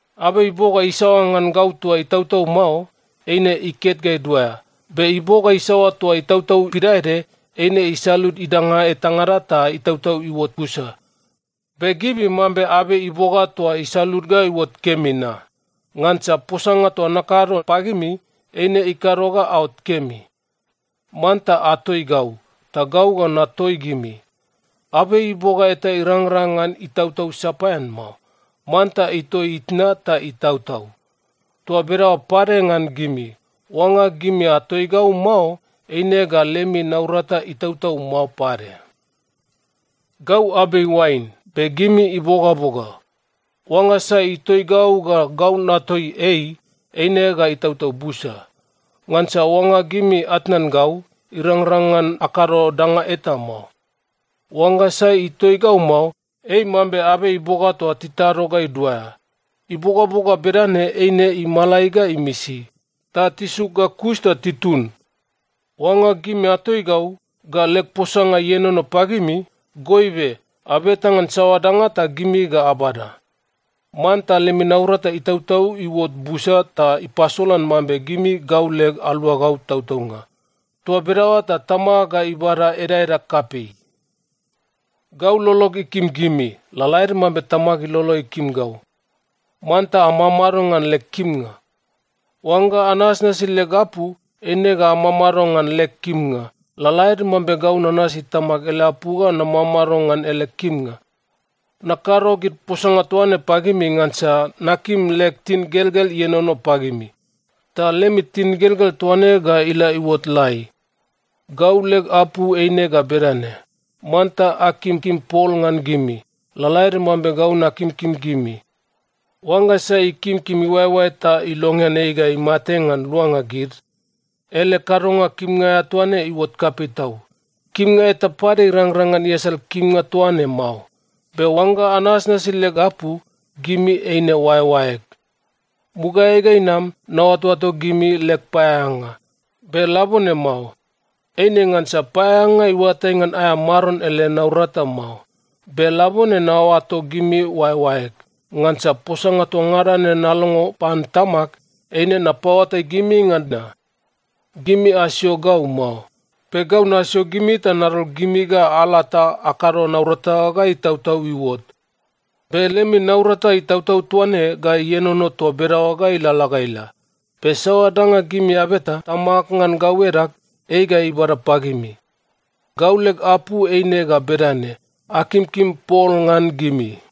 Abei iboga isaoa ngan gau toa itautau mao, eine iket ga iduaea, be iboga isaoa toa itautau pidaede, eine isalud idanga etangada ta itautau iuot busa. Be gimi mambe abei iboga toa isalud ga iuot kemi na. Ngansa posanga toa nakado pagimi, eine ikado ga aot kemi. Manta atoi gau, ta gau ga natoi gimi. Abei iboga eta irangrang ngan itautau sapaean mao. Manta itoi itna ta itautau. Toa bedaoa pade ngan gimi. Oangga gimi atoi gau mao, eine ga lemi naurata itautau mao pade. “Gau abei oain, be gimi ibogaboga. Oangga sai itoi gau ga gau natoi ei, eine ga itautau busa. Ngansa oangga gimi atnan gau, irangrang ngan akado danga eta mao. Oangga sai itoi gau mao, ei mambe abei iboga toa titado ga iduaea. Ibogaboga bedane eine imalai ga imisi, ta tisuk ga kus ta titun. Oangga gimi atoi gau, ga leg posanga ienono pagimi, goibe abeta ngan saoa danga ta gimi ga abada. Manta lemi naurata itautau iuot busa ta ipasolan mambe gimi gau leg aluagau tautaunga. Toa bedaoa ta Tamag ga ibada edaeda kapei. “Gau lolog ikim gimi, lalaede mambe Tamag ilolo ikim gau. Manta amamado ngan leg kimnga. Oangga anasnasi leg apu, eine ga amamado ngan leg kimnga, lalaede mambe gau nanasi Tamag ele apu ga namamado ngan ele kimnga. Nakado gid posanga toa ne pagimi ngansa nakim leg tingelgel ienono pagimi, ta lemi tingelgel toa ne ga ila iuot lai. Gau leg apu eine ga bedane: Manta akimkim pol ngan gimi, lalaede mambe gau nakimkim gimi. Oangga sai ikimkim iuaeoae ta ilongean ei ga imate ngan luanga gid, ele kadonga kimnga aea toa ne iuot kapei tau. Kimnga eta pade irangrang ngan iasal kimnga toaine mao. Be oangga anasnasi leg apu, gimi eine oaeoaeg. Mugaeai ga inam, naoatoato gimi leg paeaeanga, be labone mao. Eine ngansa paeaeanga iuatai ngan aea maron ele naurata mao. Be labone naoato gimi oaeoaeg, ngansa posanga toa ngada ne nalongo pan Tamag, eine napaoatai gimi ngan na. Gimi asio gau mao. Be gau nasio gimi ta nadol gimi ga ala ta akado naurata ga itautau iuot. Be lemi naurata itautau toa ne ga ienono toa bedaoa ga ilalala ga ila. Be saoa danga gimi abeta Tamag ngan gau edag, ei ga ibada pagimi. Gau leg apu eine ga bedane: Akimkim pol ngan gimi.”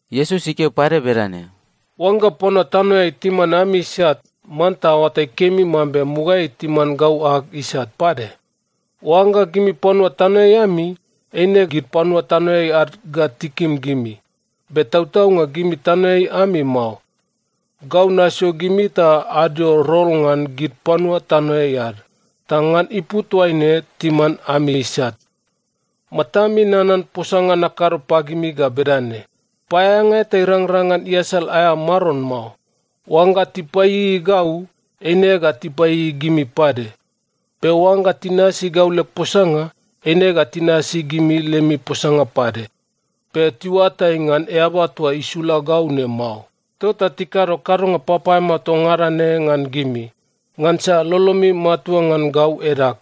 Iesus ikeo pade bedane, “Oangga panua tanoeai timan ami isat, manta aoatai kemi mambe mugaeai timan gau ag isat pade. Oangga gimi panua tanoeai ami, eine gid panua tanoeai ad ga tikim gimi. Be tautaunga gimi tanoeai ami mao. Gau nasio gimi ta adio rol ngan gid panua tanoeai ad, ta ngan ipu toaine timan ami isat. Matami nanan posanga nakado pagimi ga bedane, ‘Paeaeanga eta irangrang ngan iasal aea maron mao.’ Oangga tipaieiei gau, eine ga tipaieiei gimi pade. Be oangga tinasi gau leg posanga, eine ga tinasi gimi lemi posanga pade. Be tiuatai ngan Eaba toa isula gau ne mao, tota tikado kadonga papaeamao toa ngada ne ngan gimi, ngansa lolomi matua ngan gau edag.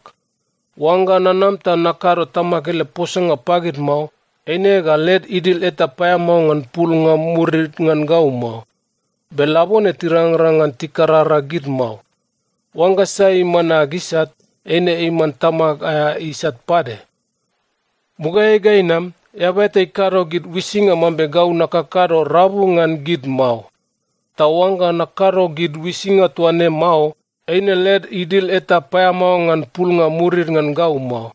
Oangga nanam ta nakado Tamag ele posanga pagid mao, eine ga led idil eta paeamao ngan pulnga murid ngan gau mao. Be labone tirangrang ngan tikarara gid mao. Oangga sai iman ag isat, eine iman Tamag aea isat pade. Mugaeai ga inam, eaba eta ikado gid uisinga mambe gau nakakado rabu ngan gid mao. Ta oangga nakado gid uisinga toa ne mao, eine led idil eta paeamao ngan pulnga murid ngan gau mao.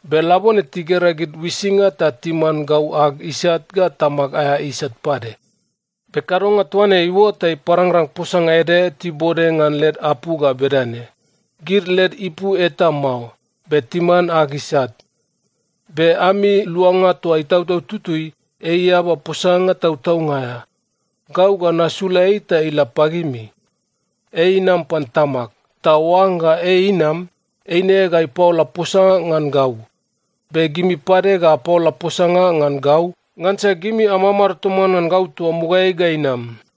Be labone tigera gid uisinga, ta timan gau ag isat ga Tamag aea isat pade. Be kadonga toa ne iuot ta iparangrang posanga ede tibode ngan led apu ga bedane, ‘Gid led ipu eta mao, be timan ag isat.’ “Be ami Luanga toa Itautau Tutui, ei Eaba posanga tautaunga aea. Gau ga nasula ei ta ila pagimi. Ei inam pan Tamag. Ta oangga ei inam, eine ga ipaola posanga ngan gau. Be gimi pade ga apaola posanga ngan gau, ngansa gimi amamado toman ngan gau toa mugaeai ga inam.